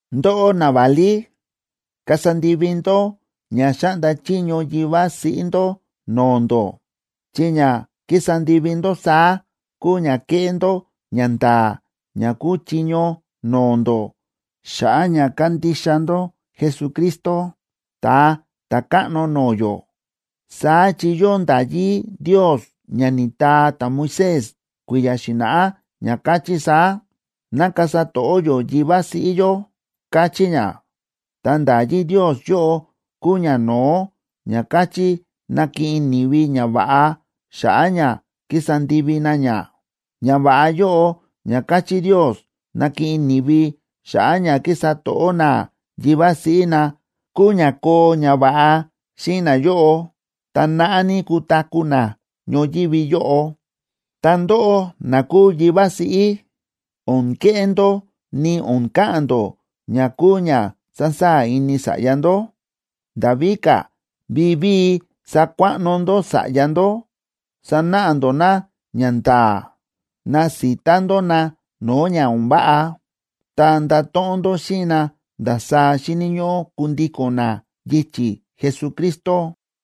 Ndóꞌó naválí, kasa ndivi ndó ña xáꞌnda chiño yivá siꞌí ndó no̱o̱ ndó, chi ña kísa ndivi ndó saá kúu ña kéꞌé ndó ñanda̱a̱ ña kúu chiño no̱o̱ ndó xa̱ꞌa̱ ña kándixa ndó Jesucristo, Ta̱a Ta̱káꞌno no̱o̱ yó. Saá chi yóo nda̱yí Ndios ña ni̱taa ta̱Moisés kui̱ya̱ xi̱na̱ꞌá, ña káchí saá: “Ná kasa to̱ꞌó yó yivá siꞌí yó”, káchí ña. Ta nda̱yí Ndios yóꞌo kúu ñano̱ó ña káchí nakiꞌin ni̱vi ñava̱ꞌa xa̱ꞌa̱ ña kísa ndivi na ña. Ñava̱ꞌa yóꞌo ña káchí Ndios nakiꞌin ni̱vi xa̱ꞌa̱ ña kísa to̱ꞌó na yivá siꞌí na, kúu ña koo ñava̱ꞌa xíꞌin nayóꞌo, ta naꞌá ní kutaku̱ na ñoyívi yóꞌo. Ta ndóꞌó na kúu yivá siꞌí, o̱n keꞌé ndó ni o̱n ka̱ꞌa̱n ndó ña kúu ña sasaa̱ ini sa̱ꞌya ndó. Nda̱ víka̱, vivíi sakuaꞌno ndó sa̱ꞌya ndó, sanáꞌa ndó na ñanda̱a̱, nasita ndó na no̱o̱ ña o̱n váꞌa, ta ndato̱ꞌon ndó xíꞌin na ndasaá xíni̱ ñóꞌó kundíko̱n na yichi̱ Jesucristo.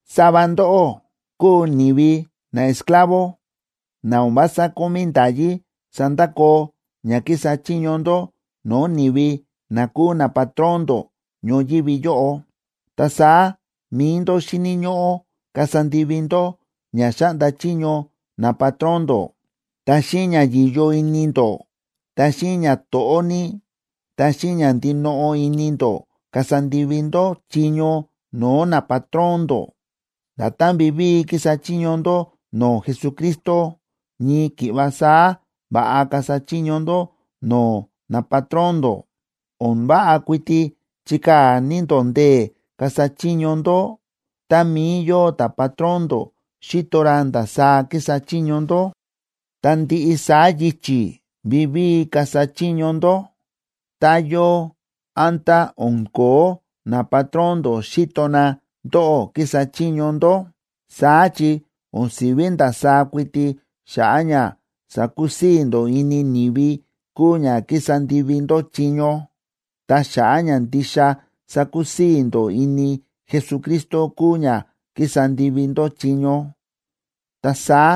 Sava ndóꞌó kúu ni̱vi naesclavo na o̱n vása kómí nda̱yí sandakoo ña kísa chiño ndó no̱o̱ ni̱vi na kúu napatrón ndó ñoyívi yóꞌo. Ta saá mi̱i ndó xíni̱ ñóꞌó kasa ndivi ndó ña xáꞌnda chiño napatrón ndó, ta xíꞌin ña yi̱yo ini ndó, ta xíꞌin ñato̱ꞌó ní, ta xíꞌin ña ndinoꞌo ini ndó kasa ndivi ndó chiño no̱o̱ napatrón ndó. Nda̱tán vivíi kísa chiño ndó no̱o̱ Jesucristo, ñii ki̱ꞌva saá va̱ꞌa kasa chiño ndó no̱o̱ napatrón ndó. O̱n váꞌa kuiti chikaa̱ ní ndó ndee̱ kasa chiño ndó tá mií yóo ta̱patrón ndó xíto ra ndasaá kísa chiño ndó, ta ndiꞌi saá yichi̱ vivíi kasa chiño ndó, tá yóo, án tá o̱n ko̱ó napatrón ndó xíto na ndóꞌó kísa chiño ndó. Saá chi o̱n si̱ví ndasaá kuiti xa̱ꞌa̱ ña sakusii̱ ndó ini ni̱vi kúu ña kísa ndivi ndó chiño, ta xa̱ꞌa̱ ña ndixa sakusii̱ ndó ini Jesucristo kúu ña kísa ndivi ndó chiño. Ta saá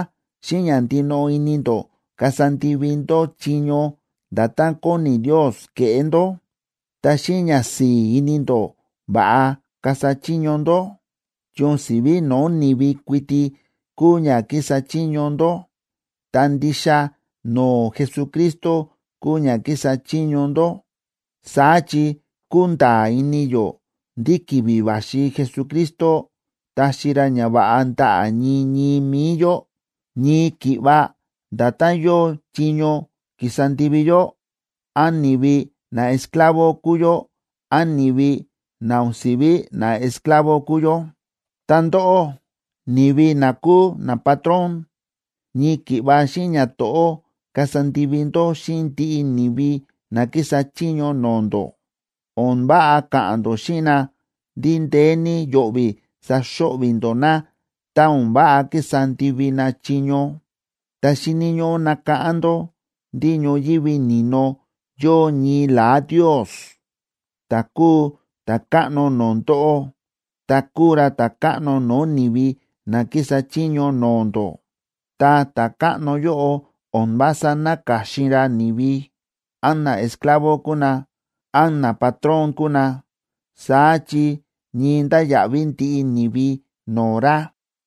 xíꞌin ña ndinoꞌo ini ndó kasa ndivi ndó chiño nda̱tán kóni Ndios keꞌé ndó. Ta xíꞌin ñasi̱i̱ ini ndó va̱ꞌa kasa chiño ndó, chi o̱n si̱ví no̱o̱ ni̱vi kuiti kúu ña kísa chiño ndó, ta ndixa no̱o̱ Jesucristo kúu ña kísa chiño ndó. Saá chi kúnda̱a̱ ini yó ndí ki̱vi̱ va̱xi Jesucristo taxi ra ñava̱ꞌa ndaꞌa̱ ñii ñii mi̱i yó ñii ki̱ꞌva nda̱tán yóo chiño ki̱sa ndivi yó, án ni̱vi naesclavo kúu yó, án ni̱vi na o̱n si̱ví naesclavo kúu yó. Ta ndóꞌó, ni̱vi na kúu napatrón, ñii ki̱ꞌva xíꞌin ñato̱ꞌó kasa ndivi ndó xíꞌin ndiꞌi ni̱vi na kísa chiño no̱o̱ ndó. O̱n váꞌa ka̱ꞌa̱n ndó xíꞌin na ndí ndeé ní yo̱ꞌvi̱ saxo̱ꞌvi̱ ndó na tá o̱n váꞌa kísa ndivi na chiño. Ta xíni̱ ñóꞌó nakáꞌán ndó ndí ñoyívi ni̱no yóo ñii la̱á Ndios, ta̱ kúu Ta̱káꞌno no̱o̱ ndóꞌó ta kúu ra Ta̱káꞌno no̱o̱ ni̱vi na kísa chiño no̱o̱ ndó. Ta Ta̱káꞌno yóꞌo o̱n vása náka̱xin ra ni̱vi, án naesclavo kúu na, án napatrón kúu na, saá chi ñii ndáya̱ꞌví ndiꞌi ni̱vi no̱o̱ ra.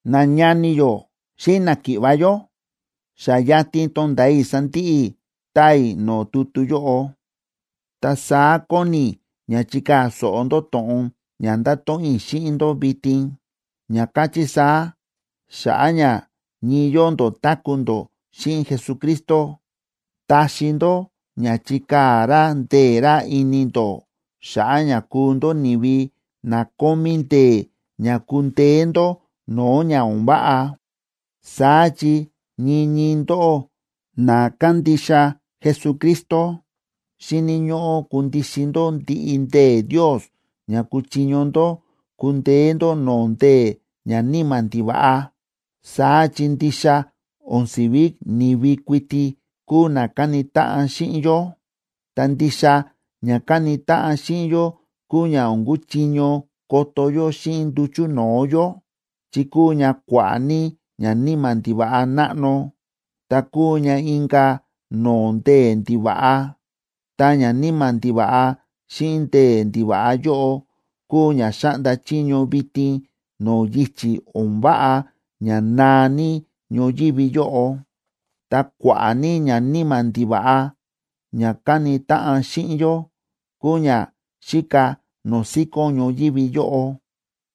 Nañani yó xíꞌin náki̱ꞌva̱ yó, xa yatin tonda̱a i̱ sandiꞌi i̱ taa i̱ no̱o̱ tutu yóꞌo. Ta saá kóni i̱ ña chikaa̱ so̱ꞌo ndó to̱ꞌon ña ndáto̱ꞌon i̱ xíꞌin ndó vitin, ña káchí saá: Xa̱ꞌa̱ ña ñii yóo ndó táku̱ ndó xíꞌin Jesucristo, taxi ndó ña chikaa̱ ra ndee̱ ra ini ndó xa̱ꞌa̱ ña kuu ndó ni̱vi na kómí ndee̱ ña kundeé ndó no̱o̱ ña o̱n váꞌa. Saá chi ñii ñii ndóꞌó na kándixa Jesucristo, xíni̱ ñóꞌó kundixin ndó ndiꞌi ndee̱ Ndios ña kuchiño ndó kundeé ndó no̱o̱ ndee̱ ñaníma̱ ndiva̱ꞌa. Saá chi ndixa o̱n si̱ví ni̱vi kuiti kúu na káni táꞌan xíꞌin yó, ta ndixa ña káni táꞌan xíꞌin yó kúu ña o̱n kúchiño koto yó xíꞌin nduchu̱ no̱o̱ yó, chi kúu ña kua̱ꞌa̱ ní ñaníma̱ ndiva̱ꞌa náꞌno ta kúu ña inka̱ no̱o̱ ndee̱ ndiva̱ꞌa. Ta ñaníma̱ ndiva̱ꞌa xíꞌin ndee̱ ndiva̱ꞌa yóꞌo kúu ña xáꞌnda chiño vitin no̱o̱ yichi̱ o̱n váꞌa ña naa ní ñoyívi yóꞌo. Ta kua̱ꞌa̱ ní ñaníma̱ ndiva̱ꞌa ña káni táꞌan xíꞌin yó kúu ña xíka no̱o̱ síkón ñoyívi yóꞌo.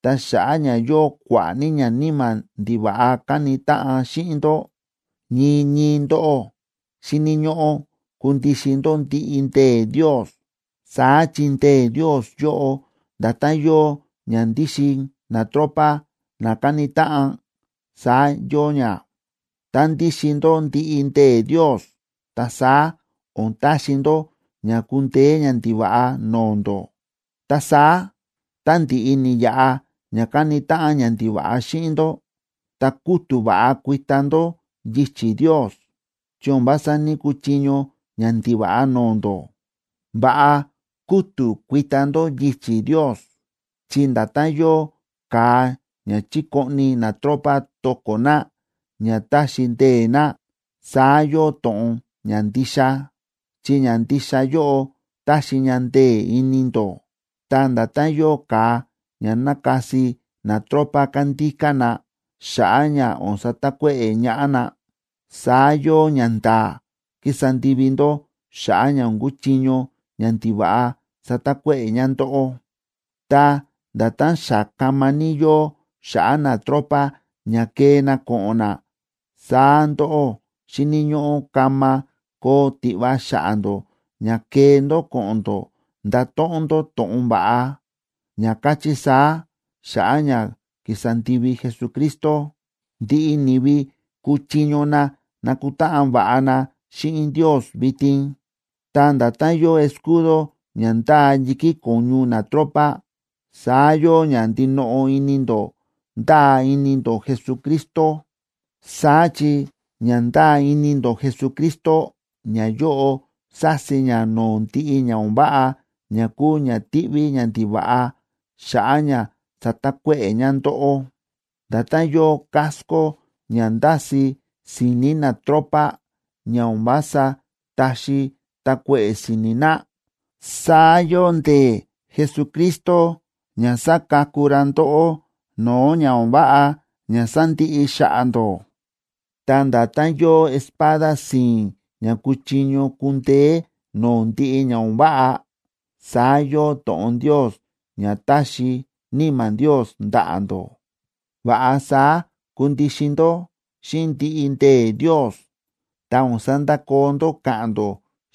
Ta xa̱ꞌa̱ ña yóo kua̱ꞌa̱ ní ñaníma̱ ndiva̱ꞌa káni táꞌan ña xíꞌin ndó, ñii ñii ndóꞌó xíni̱ ñóꞌó kundixin ndó ndiꞌi ndee̱ Ndios. Saá chi ndee̱ Ndios yóꞌo nda̱tán yóo ña ndíxin natropa na káni táꞌan, saá yóo ña. Tá ndíxin ndó ndiꞌi ndee̱ Ndios, ta saá o̱n taxi ndó ña kundeé ñandiva̱ꞌa no̱o̱ ndó. Ta saá tá ndi̱ꞌi ni̱yaꞌa ña káni táꞌan ñandiva̱ꞌa xíꞌin ndó, ta kútu̱ va̱ꞌa kuita ndó yichi̱ Ndios, chi o̱n vása ní‑kuchiño ñandiva̱ꞌa no̱o̱ ndó. Va̱ꞌa kútu̱ kuita ndó yichi̱ Ndios, chi nda̱tán yóo ka̱a ña chíkoꞌni natropa to̱ko̱ na ña táxi ndee̱ na, saá yóo to̱ꞌon ñandixa, chi ñandixa yóꞌo táxi ña ndee̱ ini ndó. Ta nda̱tán yóo ka̱a ña nákasi natropa kándíká na xa̱ꞌa̱ ña o̱n satakuéꞌe̱ ñaꞌá na, saá yóo ñanda̱a̱ kísa ndivi ndó xa̱ꞌa̱ ña o̱n kuchiño ñandiva̱ꞌa satakuéꞌe̱ ña ndóꞌó. Ta nda̱tán xa kama ní yóo xa̱ꞌa̱ natropa ña kee na ko̱ꞌo̱n na, saá ndóꞌó xíni̱ ñóꞌó kama koo tiꞌva xa̱ꞌa̱ ndó ña kee ndó ko̱ꞌo̱n ndó ndato̱ꞌon ndó to̱ꞌon va̱ꞌa, ña káchí saá: “Xa̱ꞌa̱ ña ki̱sa ndivi Jesucristo, ndiꞌi ni̱vi kúchiño na nakutáꞌan va̱ꞌa na xíꞌin Ndios vitin.” Ta nda̱tán yóo escudo ña ndáa yi̱kí ko̱ñu natropa, saá yóo ña ndinoꞌo ini ndó ndáa ini ndó Jesucristo. Saá chi ña ndáa ini ndó Jesucristo, ñayóꞌo sási ña no̱o̱ ndiꞌi ña o̱n váꞌa ña kúu ña tíꞌví ñandiva̱ꞌa xa̱ꞌa̱ ña satakuéꞌe̱ ña ndóꞌó. Nda̱tán yóo casco ña ndási si̱ni̱ natropa ña o̱n vása táxi takuéꞌe̱ si̱ni̱ na, saá yóo ndee̱ Jesucristo ña sáka̱ku ra ndóꞌó no̱o̱ ña o̱n váꞌa ña sándiꞌi xa̱ꞌa̱ ndó. Ta nda̱tán yóo espada si̱i̱n ña kúchiño kundeé no̱o̱ ndiꞌi ña o̱n váꞌa, saá yóo to̱ꞌon Ndios ña táxi Níma̱ Ndios ndaꞌa̱ ndó. Va̱ꞌa saá kundixin ndó xíꞌin ndiꞌi ndee̱ Ndios, ta o̱n sandakoo ndó káꞌa̱n ndó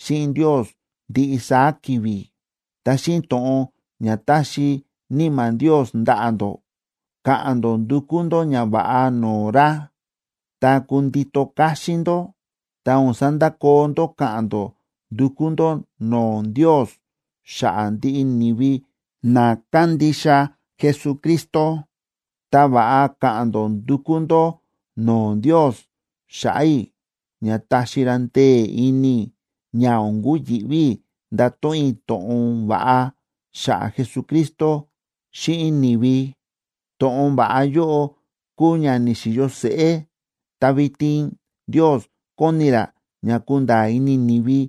xíꞌin Ndios ndiꞌi saá ki̱vi̱. Ta xíꞌin to̱ꞌon ña táxi Níma̱ Ndios ndaꞌa̱ ndó, ka̱ꞌa̱n ndó ndukú ndó ñava̱ꞌa no̱o̱ ra. Ta kundito káxín ndó, ta o̱n sandakoo ndó káꞌa̱n ndó ndúkú ndó no̱o̱ Ndios xa̱ꞌa̱ ndiꞌi ni̱vi na kándixa Jesucristo. Ta va̱ꞌa ka̱ꞌa̱n ndó ndukú ndó no̱o̱ Ndios xa̱ꞌa̱ i̱ ña taxi ra ndee̱ ini i̱ ña o̱n kuyi̱ꞌví i̱ ndato̱ꞌon i̱ to̱ꞌon va̱ꞌa xa̱ꞌa̱ Jesucristo xíꞌin ni̱vi. To̱ꞌon va̱ꞌa yóꞌo kúu ña ni̱xi̱yo seꞌé, ta vitin Ndios kóni ra ña kunda̱a̱ ini ni̱vi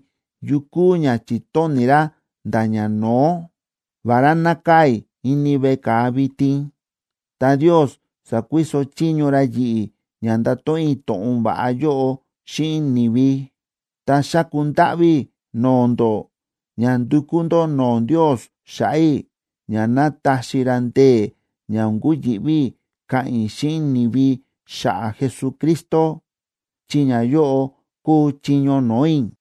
yu kúu ña chi̱tóni̱ ra nda̱ ñano̱ó. Vará nákaa̱ i̱ ini veꞌe ka̱a vitin, ta Ndios sa̱kuiso chiño ra yi̱ꞌi̱ ña ndato̱ꞌon i̱ to̱ꞌon va̱ꞌa yóꞌo xíꞌin ni̱vi. Ta xáku ndáꞌví i̱ no̱o̱ ndó ña ndukú ndó no̱o̱ Ndios xa̱ꞌa̱ i̱ ña ná taxi ra ndee̱ ña o̱n kuyi̱ꞌví i̱ ka̱ꞌa̱n i̱ xíꞌin ni̱vi xa̱ꞌa̱ Jesucristo, chi ñayóꞌo kúu chiño no̱o̱ i̱.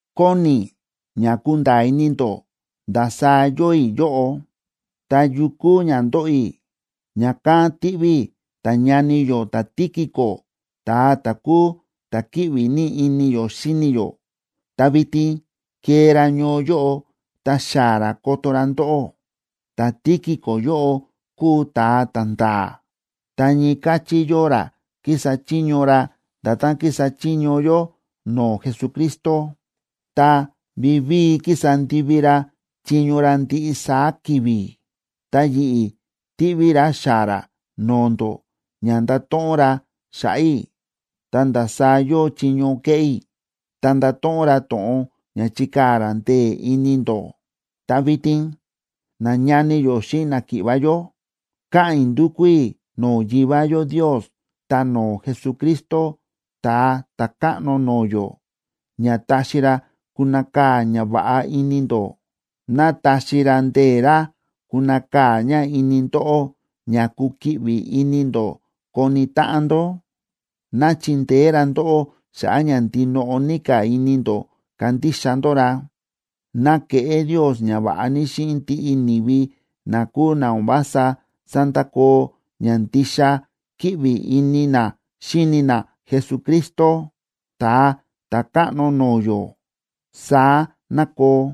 Kóni i̱ ña kunda̱a̱ ini ndó ndasaá yóo i̱ yóꞌo, ta yu kúu ña ndóꞌo i̱. Ña̱kán tíꞌví i̱ ta̱ñani yó ta̱Tíquico ta̱a ta̱ kúu ta̱ kíꞌvi ní ini yó xíni yó, ta vitin kee ra ñoo yóꞌo ta xaa̱ ra koto ra ndóꞌó. Ta̱Tíquico yóꞌo kúu ta̱a ta̱nda̱a̱, ta ñii káchí yóo ra kísa chiño ra nda̱tán kísa chiño yó no̱o̱ Jesucristo, ta vivíi kísa ndivi ra chiño ra ndiꞌi saá ki̱vi̱. Ta yi̱ꞌi̱ tíꞌví i̱ ra xaa̱ ra no̱o̱ ndó ña ndato̱ꞌon ra xa̱ꞌa̱ i̱ ta ndasaá yóo chiño kéꞌé i̱. Ta ndato̱ꞌon ra to̱ꞌon ña chikaa̱ ra ndee̱ ini ndó. Ta vitin, nañani yó xíꞌin náki̱ꞌva̱ yó, káꞌa̱n i̱ ndúkú i̱ no̱o̱ Yivá yó Ndios ta no̱o̱ Jesucristo, Ta̱a Ta̱káꞌno no̱o̱ yó, ña taxi ra kunakaa̱ ñava̱ꞌa ini ndó. Ná taxi ra ndee̱ ra kunakaa̱ ña ini ndóꞌó ña kukiꞌvi ini ndó koni táꞌan ndó. Ná chindeé ra ndóꞌó xa̱ꞌa̱ ña ndinoꞌo ní ka̱ ini ndó kandixa ndó ra. Ná keꞌé Ndios ñava̱ꞌa ní xíꞌin ndiꞌi ni̱vi na kúu na o̱n vása sándakoo ña ndixa kíꞌvi ini na xíni na Jesucristo, Ta̱a Ta̱káꞌno no̱o̱ yó. Saá ná koo.